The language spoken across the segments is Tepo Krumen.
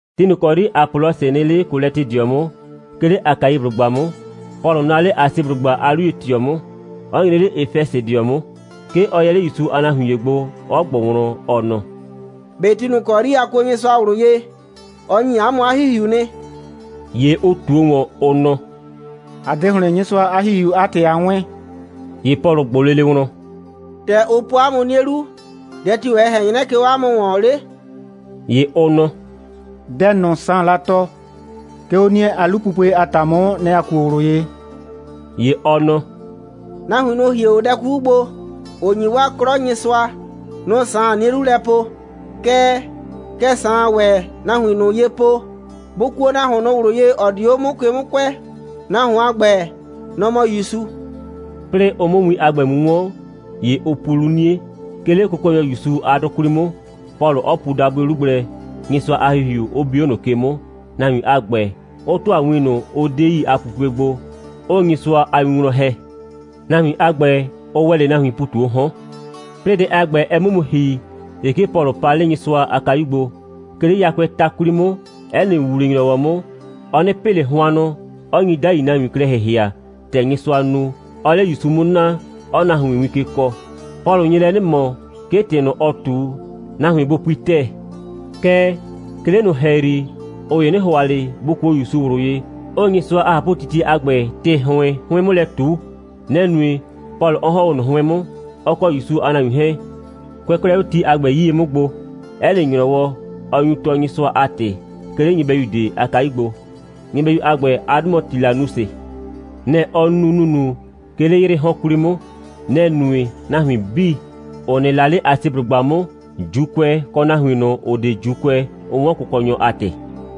Ti ꞊nʋ ‑kɔ 'yri Apɔlɔsɩ nɩ 'le Kolɛtɩdɩɔ 'mʋ, 'ke 'le Akaiblʋgba 'mʋ, Pɔlʋ naa 'le Asiblʋgba a 'luye꞊tɩɔ 'mʋ, 'ɔ nyre 'le Efɛsɩdɩɔ 'mʋ. 'Ke ɔ yɛ 'le ‑Yusu a nahuin ‑ye gbo, 'ɔ ꞊gbʋ wlɔn, ɔ nɔ: «꞊Be ti ꞊nʋ ‑kɔ 'yri a kuo Nyɩsʋa ꞊wlʋ ye, ɔ ‑nyi 'a mʋ 'a ‑Hihiu nɩ?» ‑Ye ʋ ꞊tuo ‑wɔn, ʋ nɔ: «‑A 'de ‑hlɩn Nyɩsʋa a ‑Hihiu a ‑tɩ a 'wɛɛn.» ‑Ye Pɔlʋ ꞊gbʋ lele wlɔn: «‑Tɛ ʋ po 'a mʋ 'nie 'lu, dɛ tio‑ ɛ ꞊hɛn 'nyrɛ, 'ke 'o 'a mʋ ‑wɔn 'le?» ‑Ye ʋ nɔ: «Dɛ ꞊nʋ Saan la tɔɔ, 'ke 'o 'nie a 'lupupue a ‑ta 'mʋ, nɛ‑ ‑a kuo ꞊wlʋ ye.» ‑Ye ɔ nɔ: «Nahuin ꞊nʋ, ‑ʋ hie 'o dɛ 'kuku gbo, ‑ʋ ‑nyi 'waa nɩ 'klɔ Nyɩsʋa, nʋ‑ Saan 'nie 'lu lɛ po. Kɛɛ, kɛ Saan ‑wɛ nahuin ꞊nʋ ye po: Bʋ kuo nahuon ꞊nʋ ꞊wlʋ ye, ‑ɔ dio 'o ke 'mʋ kʋɛ. Nahuon a ‑gbɛ, nɔ‑ mɔ ‑Yusu.» 'Plɩɩ ʋ 'mʋ win a ‑gbɛ mu 'wɔn, ‑ye ʋ pu 'lu 'nie, 'ke 'le Kʋkɔnyɔ ‑Yusu a 'dʋ 'kwli 'mʋ, Pɔlʋ 'ɔ pu dabʋɩ 'lu gblɛ, Nyɩsʋa a ‑Hihiu 'ʋ bi 'o ꞊nʋ ke 'mʋ, nahuin a ‑gbɛ, 'ʋ ‑tʋa win ꞊nʋ, ‑ʋ 'de yi a pupue gbo, 'ʋʋ Nyɩsʋa a win wlɔn ‑hɛ. Nahuin a ‑gbɛ, ʋ ‑wɛ 'le nahuiin ‑pu ꞊tu 'o 'hɔn. 'Plɩɩ dɛ a ‑gbɛ, ɛ 'mʋ mu ‑hi, ‑ye 'ke Pɔlʋ pa 'le Nyɩsʋa a kayu gbo. 'Ke 'le yakʋɛɛ ta 'kwli 'mʋ, 'ɛ nɩ ‑wuwle‑nyrɔwɔ 'mʋ, ɔ 'nɩ pɩ ꞊le hʋannʋ, 'ɔ nyi 'dai nahuin klɛ ‑hɩhɩa, ‑tɛ Nyɩsʋaa nu, 'ɔɔ 'le ‑Yusu 'mʋ naa, 'ɔɔ nahuin win ke kɔɔ. Pɔlʋ nye lɛ 'nɩ ꞊mɔ, 'ke ‑tɩ ꞊nʋ, ɔɔ ꞊tu, nahuin bʋ pui ‑tɛɛ. Kɛɛ, 'ke 'le ꞊nʋ ‑hɛyri, ꞊ʋ ‑ye 'nɩ ‑hʋa ꞊le, bʋ kuo ‑Yusu ꞊wlʋ ye, 'ʋʋ Nyɩsʋa a ꞊hapʋtitie a ‑gbɛ ‑tɩ ‑hʋɩn 'hʋɩn 'mʋ lɛ ꞊tu. Nɛ‑ nue, Pɔlʋ 'ɔ ‑hɔn 'o ꞊nʋ 'hʋɩn 'mʋ, ɔ kɔ ‑Yusu a nahuin 'hɛɛn. Kʋɛ 'klɛɛ 'o ti a ‑gbɛ 'yie 'mʋ gbo, 'ɛ nɩ ‑nyrɔwɔ, ɔ nyu tɔɔ Nyɩsʋa a ‑tɩ, 'ke 'le nyɩbɛyu ꞊de a kayu gbo. Nyɩbɛyu a ‑gbɛ a 'dʋ mɔ Tilanusɩ. Nɛ‑ ɔ nu ‑nunu, 'ke 'le 'yrɩɩ 'hɔn 'kwli 'mʋ. Nɛ‑ nue, nahuin 'bii, ‑ʋ nɩ la 'le Asiblʋgba 'mʋ, ‑Juukʋɛ kɔ nahuin ꞊nʋ, ‑ʋ 'de ‑Juukʋɛ, 'ʋ 'wɔn Kʋkɔnyɔ a ‑tɩ.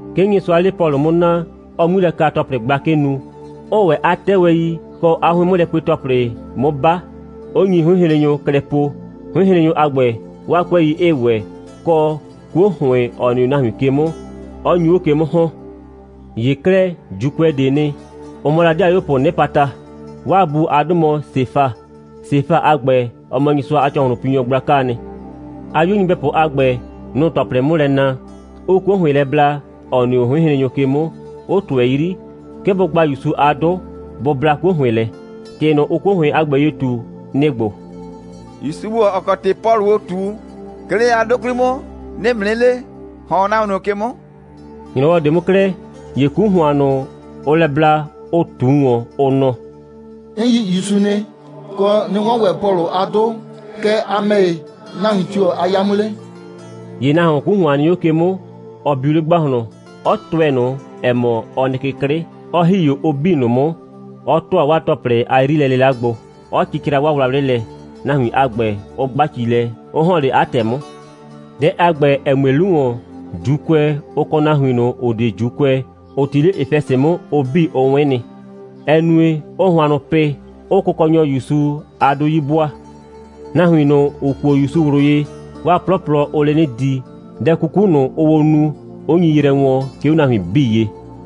'Ke Nyɩsʋaa 'le Pɔlʋ 'mʋ naa, 'ɔɔ 'ŋmilɛka‑tɔplɩ gblakɩ nu, 'ʋʋ ‑wɛ 'a 'tɛwɛi kɔ 'a 'hʋɩn'mʋlɛpue‑tɔplɩ 'mʋ 'ba, 'ʋ nyi 'hʋɩnhrennyʋ klɛ po, 'hʋɩnhrennyʋ a ‑gbɛ, 'waa 'kʋɛi 'ɩɩ ‑wɛ, kɔ, 'kuo ‑hʋɩn, ‑ɔ nɩ 'o nahuin ke 'mʋ, 'ɔ nyu 'o ke 'mʋ ‑hɔn. ‑Ye 'klɛɛ, ‑Juukʋɛ ꞊de'e nɩ. Ʋ mɔ la ‑dɩayuopʋ 'nɩpata'a nɩ. 'Waa bu a 'dʋ mɔ Sefa. Sefa a ‑gbɛ, ɔ mɔ Nyɩsʋa a ‑cɔhlʋnpinyɔ gblakaa nɩ. 'A 'yuo nyɩbɛpʋ a ‑gbɛ, nʋ‑ʋ ‑tɔplɩ 'mʋ lɛ na, 'ʋʋ 'kuo ‑hʋɩn lɛ bla, ‑ɔ nɩ 'o 'hʋɩnhrennyʋ ke 'mʋ, 'ʋ ꞊tʋɛ 'yri, 'ke bʋ gba ‑Yusu a 'dʋ, bʋ bla 'kuo ‑hʋɩn lɛ. ‑Tɩ ꞊nʋ, ʋʋ 'kuo ‑hʋɩn a ‑gbɛ ye ꞊tu, nɩ‑ ‑gbo: «‑Yusu ‑gbo, ‑ɔ kɔ ‑tɩ Pɔlʋʋ ꞊tu, 'ke 'le 'a 'dʋ 'kwli 'mʋ, 'nɩɩ ‑mʋ 'nɩ le, ‑hɔn 'o nahuon ꞊nʋ ke 'mʋ!» ‑Nyrɔwɔ ꞊de 'mʋ 'klɛɛ, ‑ye 'ku ‑hʋan ꞊nʋ, ʋʋ lɛ bla, ʋ ꞊tu ‑wɔn, ʋ nɔ: «'N yi ‑Yusu nɩ, kɔ, 'nɩ 'wɔn ‑wɛ Pɔlʋ a 'dʋ. Kɛɛ, a ‑mɛ ‑ye, nahuin tio‑ a 'ya 'mʋ 'le?» ‑ye nahuon, 'ku ‑hʋan nɩ 'o ke 'mʋ, ɔ biu 'le ‑gbahlɔn, 'ɔ tʋɛ ꞊nʋ, ‑ɛ mɔ, ɔ nɩ ke 'klɩ, 'ɔ ‑hi 'o ʋ 'bii ꞊nʋ 'mʋ, 'ɔ ‑tʋa 'waa ‑tɔplɩ a 'yrilɛ'lɩla gbo, 'ɔ cɩcra 'waa wlawlɩ lɛ, nahuin a ‑gbɛ, 'ʋ 'gba ci lɛ, 'ʋ ‑hɔn 'le 'a ‑tɛ 'mʋ. Dɛ a ‑gbɛ, ‑ɛ mue 'lu ‑wɔn, ‑Juukʋɛ, ʋ kɔ nahuin ꞊nʋ, ‑ʋ 'de ‑Juukʋɛ, ‑ʋ 'ti 'le Efɛsɩ 'mʋ, ʋ 'bii, ʋ 'wɛn nɩ. Ɛ nue, 'ʋʋ hʋannʋ pɩ, 'ʋʋ Kʋkɔnyɔ ‑Yusu a 'dʋ 'yi 'bʋaa. Nahuin ꞊nʋ, ‑ʋ kuo ‑Yusu ꞊wlʋ ye, 'waa 'plɔplɔ, ʋʋ 'le 'nɩ di, dɛ 'kuku ꞊nʋ, ʋʋ o nu, 'ʋ nyi yrɛ wɔɔn, 'ke 'o nahuin 'bii ye.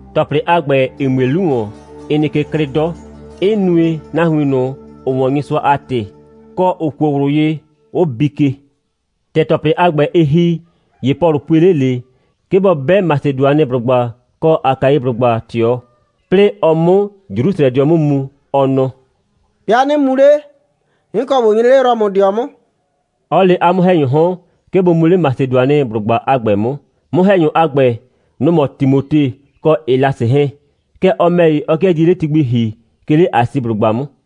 ‑Tɔplɩ a ‑gbɛ, ‑ɩ mue 'lu ‑wɔn, ɩ nɩ ke 'klɩ 'dɔ, 'ɩ nue, nahuin ꞊nʋ, ‑ʋ 'wɔn Nyɩsʋa a ‑tɩ, kɔ, ‑ʋ kuo ꞊wlʋ ye, 'ʋ bii ke. ‑Tɛ ‑tɔplɩ a ‑gbɛ, ɩ ‑hi, ‑ye Pɔlʋ pue 'le ꞊le, 'ke bɔ 'bɛ Masedʋanɩblʋgba kɔ Akaiblʋgba ꞊tɩɔ, 'plɩɩ ɔ 'mʋ Jrusrɛdɩɔ 'mʋ mu. Ɔ nɔ: «'Bɩa 'nɩ mu 'le, 'n kɔ ꞊bo nyre 'le Rɔmʋdɩɔ 'mʋ,» 'ɔ le 'a 'mʋ‑hɛnyʋʋ 'hɔn, 'ke bʋ mu 'le Masedʋanɩblʋgba a ‑gbɛ 'mʋ. 'Mʋ‑hɛnyʋ a ‑gbɛ, nʋ‑ mɔ Timote kɔ Elasɩ 'hɛɛn. Kɛɛ, ɔ ‑mɛ ‑ye, ɔ 'kɩɛ die 'le ti gbi ‑hi, 'ke 'le Asiblʋgba 'mʋ.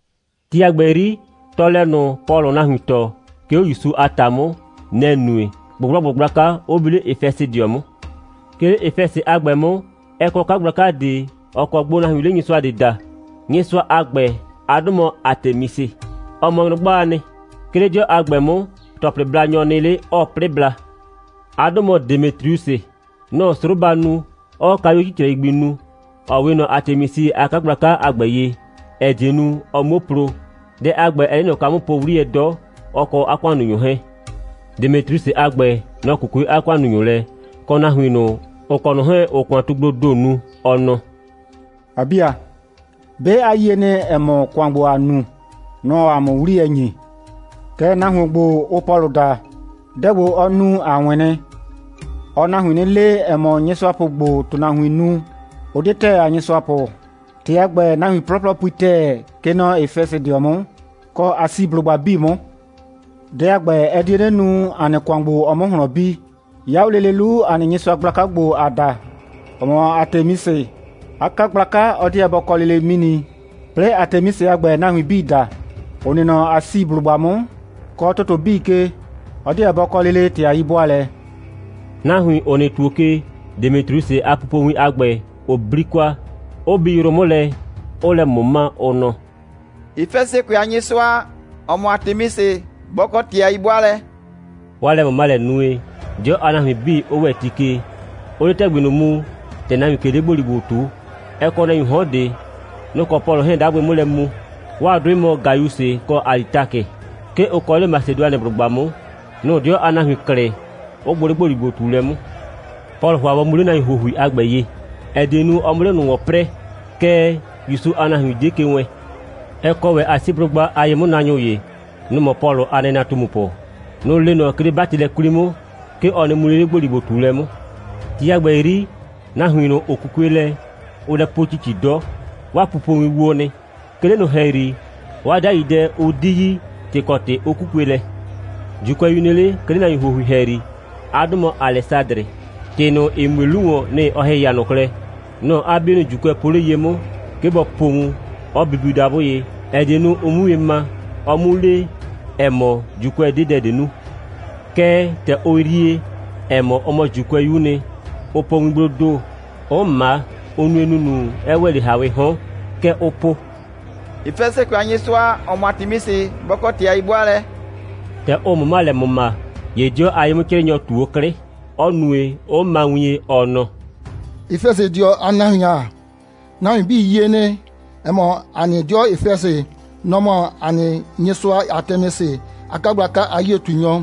Ti a ‑gbɛ 'yri, tɔɔlɛ ꞊nʋ, Pɔlʋʋ nahuin tɔɔ, 'ke 'o ‑Yusu a ‑ta 'mʋ, nɛ‑ nue, ꞊gbʋgblɔgbʋ gblaka 'ʋ bi 'le Efɛsɩdɩɔ 'mʋ. 'Ke 'le Efɛsɩ a ‑gbɛ 'mʋ, ɛ kɔ 'kagblaka ꞊de, ‑ɔ kɔ gbo nahuiin 'le nyɩsʋa ꞊de daa. Nyɩsʋa a ‑gbɛ a 'dʋ mɔ Atemisɩ. Ɔ mɔ nyrʋgbaa nɩ. 'Ke 'le 'dɩɔ a ‑gbɛ 'mʋ, ‑tɔplɩblanyɔ nɩ 'le, 'ɔɔ 'plɩ bla. 'A 'dʋ mɔ Demetriusɩ. Nɔ‑ɔ 'sroba nu, 'ɔɔ kayuo 'cicrɛi gbi nu, ‑ɔ 'we ꞊nɔ Atemisɩ a 'kagblaka a ‑gbɛ ye, ‑ɛ die nu, ʋ 'muo plo. Dɛ a ‑gbɛ, ɛɛ 'le ꞊nɔ kwa 'mʋ po 'wliyɛ 'dɔ, ɔ kɔ 'a ‑kʋannunyʋ 'hɛɛn. Demetriusɩ a ‑gbɛ, nɔ‑ 'kukue 'a ‑kʋannunyʋ lɛ, kɔ nahuin ꞊nʋ, ‑ʋ kɔ ꞊nʋ 'hɛɛn, ‑ʋʋ ‑kʋantugbloo ‑do nu, ɔ nɔ: «‑A 'bi ‑a, 'be a yie nɩ, ‑ɛ mɔ, ‑kʋan ‑gbo, ‑aa nu, nɔ‑ɔ ‑a mʋ 'wliyɛ ‑nyi. Kɛɛ, nahuon ‑gbo, ʋʋ Pɔlʋ daa, dɛ ‑gbo, ɔ nu, a 'wɩn nɩ. Ɔɔ nahuin 'nɩ le, ‑ɛ mɔ, nyɩsʋapʋ ‑gbo, ‑tʋnahuiin nu, ʋ 'de ‑tɛɛ a nyɩsʋapʋ. ‑Tɩ a ‑gbɛ, nahuin 'plɔplɔ pui ‑tɛɛ, kɛ nɔ Efɛsɩdɩɔ 'mʋ, kɔ Asiblʋgba 'bii 'mʋ. Dɛ a ‑gbɛ, ɛ die 'nɩ nu, ‑a nɩ ‑kʋan ‑gbo, ɔ 'mʋ ꞊hlɔn bi. 'Ya 'o lele 'lu, ‑a nɩ nyɩsʋa gblaka ‑gbo, ‑aa da, ‑ɔ mɔ Atemisɩ, 'a 'kagblaka, ɔ 'deɛ bɔ kɔ lele 'mini, 'plɩɩ Atemisɩ a ‑gbɛ, nahuin 'bii da, ‑ʋ nɩ nɔ Asiblʋgba 'mʋ, kɔ ‑tʋtʋ 'bii ke, ɔ 'deɛ bɔ kɔ lele ‑tɩ a 'yi'bʋaalɛ.» Nahuin, ‑ʋ nɩ ‑tuo ke, Demetriusɩ a pupowin a ‑gbɛ, ʋ 'bli kwa, 'ʋ bi yrʋ 'mʋ lɛ, 'ʋʋ lɛ ꞊mʋma, ʋ nɔ: «Efɛsɩkʋɛ a nyɩsʋa, ‑ɔ mɔ Atemisɩ, bɔ kɔ ‑tɩ a 'yi'bʋaalɛ!» 'Waa lɛ꞊mʋmalɛ nue, 'dɩɔ a nahuin 'bii 'ʋ ‑wɛ ti ke, 'ʋʋ 'le ‑tɛgbi ꞊nʋ mu, ‑tɛ nahuiin ꞊ke 'le ‑gboligbo ꞊tuu. Ɛ kɔ nahuiin 'hɔn ꞊de. Nʋ‑ kɔ Pɔlʋ 'hɛɛn 'dagbɩ 'mʋ lɛ mu. 'Waa 'dʋɩ mɔ Gayusɩ kɔ Alitakɩ. 'Ke ʋ kɔ 'le Masedʋanɩblʋgba 'mʋ. Nʋ‑ 'dɩɔ a nahuin klɩ, 'ʋ gbʋ 'le ‑gboligbo꞊tuulɛ 'mʋ. Pɔlʋ ‑hʋa bɔ mu 'le nahuin ‑huohui a ‑gbɛ ye, ‑ɛ die nu, ɔ 'mʋ 'le ꞊nʋ ‑wɔn 'prɛɛ. Kɛɛ, ‑Yusu a nahuin 'die ke wɛɛn. Ɛ kɔ ‑wɛ Asiblʋgba a ye'mʋnaanyʋ ‑ye. Nʋ‑ mɔ Pɔlʋ a nɩnatumupʋ. Nʋ‑ le ꞊nɔ, 'ke 'le 'batɩlɛ 'kwli 'mʋ, 'ke ɔ nɩ mu 'le 'le ‑gboligbo꞊tuulɛ 'mʋ. Ti a ‑gbɛ 'yri, nahuin ꞊nʋ, ‑ʋ 'kukue lɛ, ʋʋ lɛ po ‑cici 'dɔ. 'Waa pupowin wo nɩ. 'Ke 'le ꞊nʋ ‑hɛyri, 'waa 'dai dɛ, ʋ 'di yi, ‑tɩ kɔ ‑tɩ ʋ 'kukue lɛ. ‑Juukʋɛyu nɩ 'le, 'ke 'le nahuin ‑huohui ‑hɛyri. 'A 'dʋ mɔ Alɛsadrɩ. ‑Tɩ ꞊nʋ, ‑ɩ mue 'lu ‑wɔn, nɩ‑ ʋ ‑hɩhɩa ꞊nɔ klɛ. Nɔ‑ 'a 'bienʋ ‑Juukʋɛ po 'le ye 'mʋ, 'ke bɔ po wun, 'ɔ bibiu dabʋ ye, ‑ɛ die nu, ʋ 'mʋ wien ma, ɔ 'mu le, ‑ɛ mɔ, ‑Juukʋɛ 'de dɛ ꞊de nu. Kɛɛ, ‑tɛ ʋ yrie, ‑ɛ mɔ, ɔ mɔ ‑Juukʋɛyu'u nɩ, ʋ po wingbloo ‑do, 'ʋ ꞊ma, 'ʋ nue ‑nunu, ɛ ‑wɛ 'le ‑hawɩɩ 'hɔn. Kɛ ʋʋ po: «Efɛsɩkʋɛ a nyɩsʋa, ‑ɔ mɔ Atemisɩ, bɔ kɔ ‑tɩ a 'yi'bʋaalɛ!» ‑Tɛ ʋ ꞊mʋma lɛ ‑mʋma, ‑ye 'dɩɔ a ye'mʋ'crɩɩnyɔ ꞊tu 'o 'klɩ, 'ɔ nue, 'ʋ ma wien, ɔ nɔ: «Efɛsɩdɩɔ a nahuin ‑a, nahuin 'bii yie nɩ, ‑ɛ mɔ, ‑a nɩ 'dɩɔ Efɛsɩ, nɔ‑ mɔ ‑a nɩ nyɩsʋa Atemisɩ a 'kagblaka a 'yie꞊tunyɔ,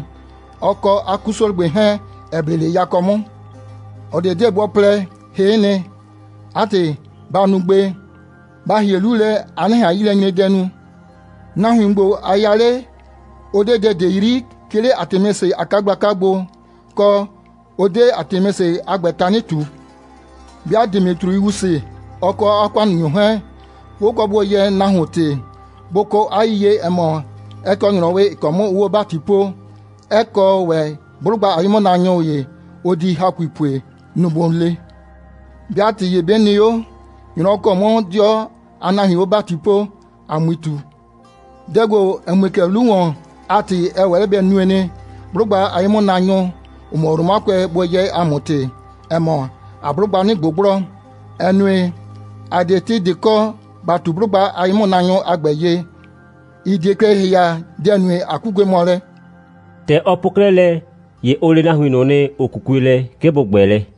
ɔ kɔ 'a 'kusrɔgbe 'hɛɛn, ‑ɛ ble 'le yakɔ 'mʋ. ꞊Ɔ ꞊de 'deɛ bɔ plɛ, hɩ'ɩ nɩ. 'A ‑tɩ, ba nu gbe, ba ‑hie 'lu lɛ, a 'nɩ ꞊han 'yilɛnyredɛ nu. Nahuin ‑gbo, a ya 'le, ʋ 'de dɛ ꞊de 'yri, 'ke 'le Atemisɩ a 'kagblaka gbo, kɔ, ʋ 'de Atemisɩ a ‑gbɛ tanɩ ꞊tu. 'Bɩa Demetriusɩ, ɔ kɔ 'a ‑kʋannunyʋ 'hɛɛn, 'bʋ kɔ bʋ yɛɛ nahuon ‑tɩ, bʋ kɔ 'a yiyie, ‑ɛ mɔ, ɛ kɔ ‑nyrɔwɩ, ‑ɩ kɔ 'mʋ ʋʋ 'o ‑bati poo, 'ɛ kɔ ‑wɛ 'blʋgba a ye'mʋnaanyʋ ‑ye, ʋ di ‑hakui pue. Nʋ‑ bʋ le. 'Bɩa ‑tɩ ‑ye 'bɩ nɩ 'o, ‑nyrɔwɔ ‑kɔ 'mʋ 'dɩɔ a nahuiin 'o ‑bati poo, ‑a 'mui ꞊tu. Dɛ ‑gbo, ‑ɛ mue kɛ 'lu ‑wɔn a ‑tɩ, ɛ ‑wɛ 'le bɛ nue nɩ, 'blʋgba a ye'mʋnaanyʋ, ‑ʋ mɔ Romakʋɛ, bʋ yɛɛ ‑a mʋ ‑tɩ, ‑ɛ mɔ, ‑aa 'blʋgba 'nɩ ꞊gbʋgblɔ, ‑ɛ nue, ‑a 'de ‑tɩ ꞊de kɔ, ‑ba ꞊tu 'blʋgba a ye'mʋnaanyʋ a ‑gbɛ ye, ‑ɩ die klɛ ‑hɩhɩa, dɛ‑ nue, ꞊a 'kukue mɔ lɛ.» ‑Tɛ ɔ po 'klɛɛ lɛ, ‑ye ʋ le nahuin ꞊nʋ nɩ, ‑ʋ 'kukue lɛ, 'ke bʋ ‑gbɛ lɛ.